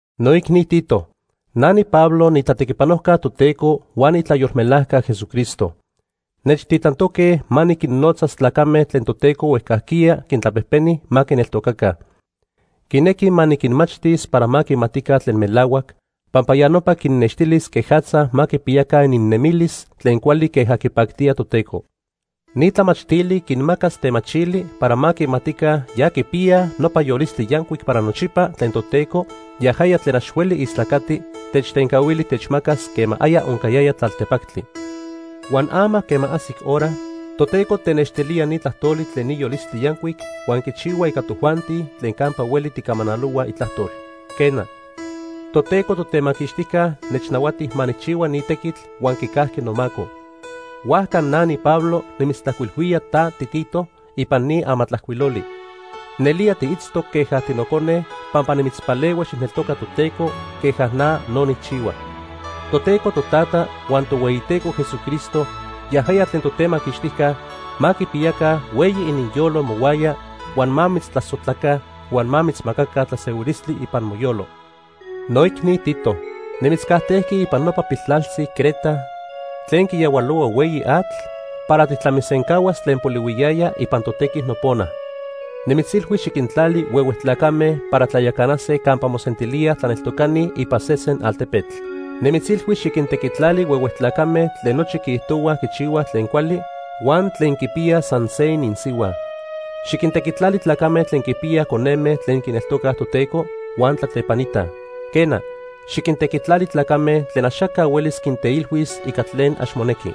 Noicni Tito, na niPablo niitlatequipanojca Toteco huan niitlayolmelajca Jesucristo. Nechtitlantoque ma niquinnotzas tlacame tlen Toteco huejcajquiya quintlapejpeni ma quineltocaca. Quinequi ma niquinmachtis para ma quimatica tlen melahuac, pampa ya nopa quinnextilis quejatza ma quipiyaca ininnemilis tlen cuali queja quipactía Toteco. Ni tlamachtili quinmacas temachili para ma quimatica ya quipiyaj nopa yolistli yancuic para nochipa tlen Toteco, yajaya tlen ax hueli istlacati, techtencahuili techmacas quema aya oncayaya tlaltepactli. Huan ama quema ajsic hora, Toteco tenextilía ni tlajtoli tlen ni yolistli yancuic huan quichihua ica tojuanti tlen campa hueli tijcamanalohuaj itlajtol. Quena, Toteco Totemaquixtijca nechnahuati ma nijchihua ni tequitl huan quicajqui nomaco. Huajca na niPablo nimitztlajcuilhuía ta tiTito ipan ni amatlajcuiloli. Nelía tiitztoc queja tinocone pampa nimitzpalehui xijneltoca Toteco queja na no nijchihua. Toteco Totata huan Tohueyiteco Jesucristo yajaya tlen Totemaquixtijca ma quipiyaca hueyi ininyolo mohuaya huan ma mitztlasojtlaca huan ma mitzmacaca tlasehuilistli ipan moyolo. Noicni Tito, nimitzcajtejqui ipan nopa piltlaltzi Creta tlen quiyahualohua hueyi atl para tijtlamisencahuas tlen polihuiyaya ipan totequi nopona. Nimitzilhui xiquintlali huehue tlacame para tlayacanase campa mosentilíaj tlaneltocani ipan sesen altepetl. Nimitzilhui xiquintequitlali huehue tlacame tlen nochi quiijtohuaj quichihuaj tlen cuali, huan tlen quipiyaj san se ininsihua. Xiquintequitlali tlacame tlen quinpiyaj coneme tlen quineltocaj Toteco, huan tlatlepanitaj. Quena, xiquintequitlali tlacame tlen axaca huelis quinteilhuis ica tlen ax monequi.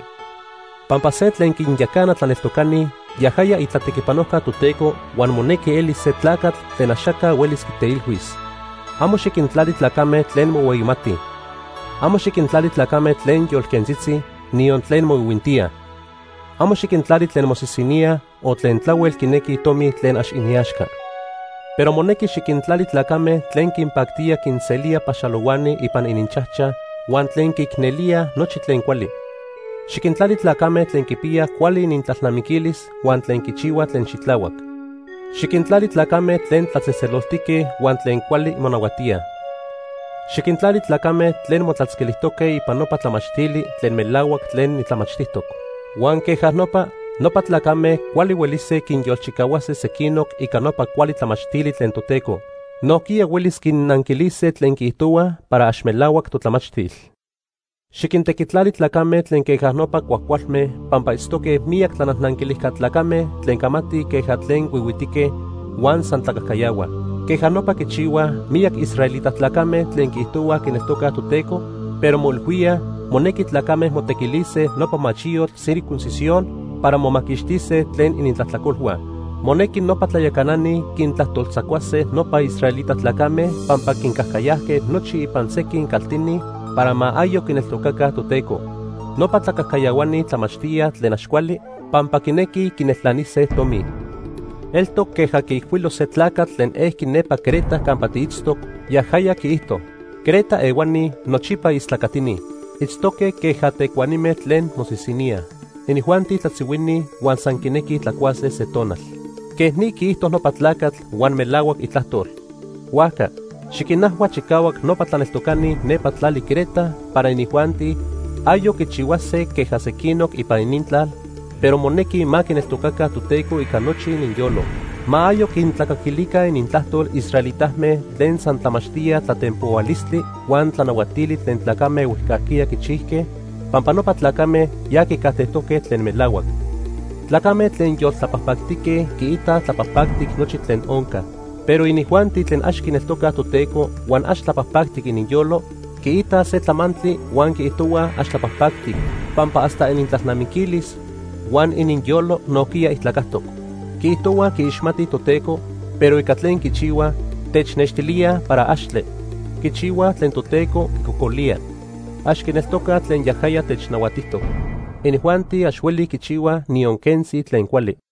Pampa se tlen quinyacana tlaneltocani, yajaya itlatequipanojca Toteco huan monequi elis se tlacatl tlen axaca huelis quiteilhuis. Amo xiquintlali tlacame tlen mohueyimatij. Amo xiquintlali tlacame tlen yolquentzitzi, niyon tlen moihuintíaj. Amo xiquintlali tlen mosisiníaj o tlen tlahuel quinequij tomi tlen ax iniaxca. Pero monequi xiquintlali tlacame tlen quinpactía quinselíaj paxalohuani ipan ininchajchaj huan tlen quiicnelíaj nochi tlen cuali. Xiquintlali tlacame tlen quipiyaj cuali inintlalnamiquilis huan tlen quichihuaj tlen xitlahuac. Xiquintlali tlacame tlen tlatzejtzeloltique huan tlen cuali monahuatíaj. Xiquintlali tlacame tlen motlatzquilijtoque ipan nopa tlamachtili tlen melahuac tlen nitlamachtijtoc. Huan queja nopa, nopa tlacame cuali huelise quinyolchicahuase sequinoc ica nopa cuali tlamachtili tlen Toteco. Nojquiya huelis quinnanquilise tlen quiijtohuaj para ax melahuac totlamachtil. Xiquintequitlali tlacame tlen queja nopa cuajcualme pampa itztoque miyac tlanajnanquilijca tlacame tlen camatij queja tlen huihuitique, huan san tlacajcayahuaj. Queja nopa quichihuaj miyac israelita tlacame tlen quiijtohuaj quineltocaj Toteco, pero moilhuíaj monequi tlacame motequilise nopa machiyotl circuncisión para momaquixtise tlen inintlajtlacolhua. Monequi nopa tlayacanani quintlajtoltzacuase nopa israelita tlacame pampa quincajcayajque nochi ipan sequin caltini para ma ayoc quineltocaca Toteco. Nopa tlacajcayahuani tlamachtíaj tlen ax cuali pampa quinequij quineltlanise tomi. Eltoc queja quiijcuilo se tlacatl tlen ejqui nepa Creta campa tiitztoc, yajaya quiijto: “Creta ehuani nochipa istlacatini. Itztoque queja tecuanime tlen mosisiníaj. Inijuanti tlatzihuini huan san quinequij tlacuase se tonal.” Quej ni quiijto nopa tlacatl, huan melahuac itlajtol. Huajca, xiquinajhua chicahuac nopa tlaneltocani nepa tlali Creta para inijuanti ayoc quichihuase queja sequinoc ipan inintlal, pero monequi ma quineltocaca Toteco ica nochi ininyolo. Ma ayoc quintlacaquilica inintlajtol israelitame tlen san tlamachtíaj tlatempohualistli huan tlanahuatili tlen tlacame huejcajquiya quichijque, pampa nopa tlacame ya quicajtejtoque tlen melahuac. Tlacame tlen yoltlapajpactique quiitaj tlapajpactic nochi tlen onca. Pero inijuanti tlen ax quineltocaj Toteco huan ax tlapajpactic ininyolo, quiitaj se tlamantli huan quiijtohuaj ax tlapajpactic pampa hasta inintlalnamiquilis huan ininyolo nojquiya ijtlacajtoc. Quiijtohuaj quiixmatij Toteco, pero ica tlen quichihuaj, technextilíaj para axtle. Quichihuaj tlen Toteco quicocolía. Ax quineltocaj tlen yajaya technahuatijtoc. Inijuanti ax huelij quichihuaj niyon quentzi tlen cuali.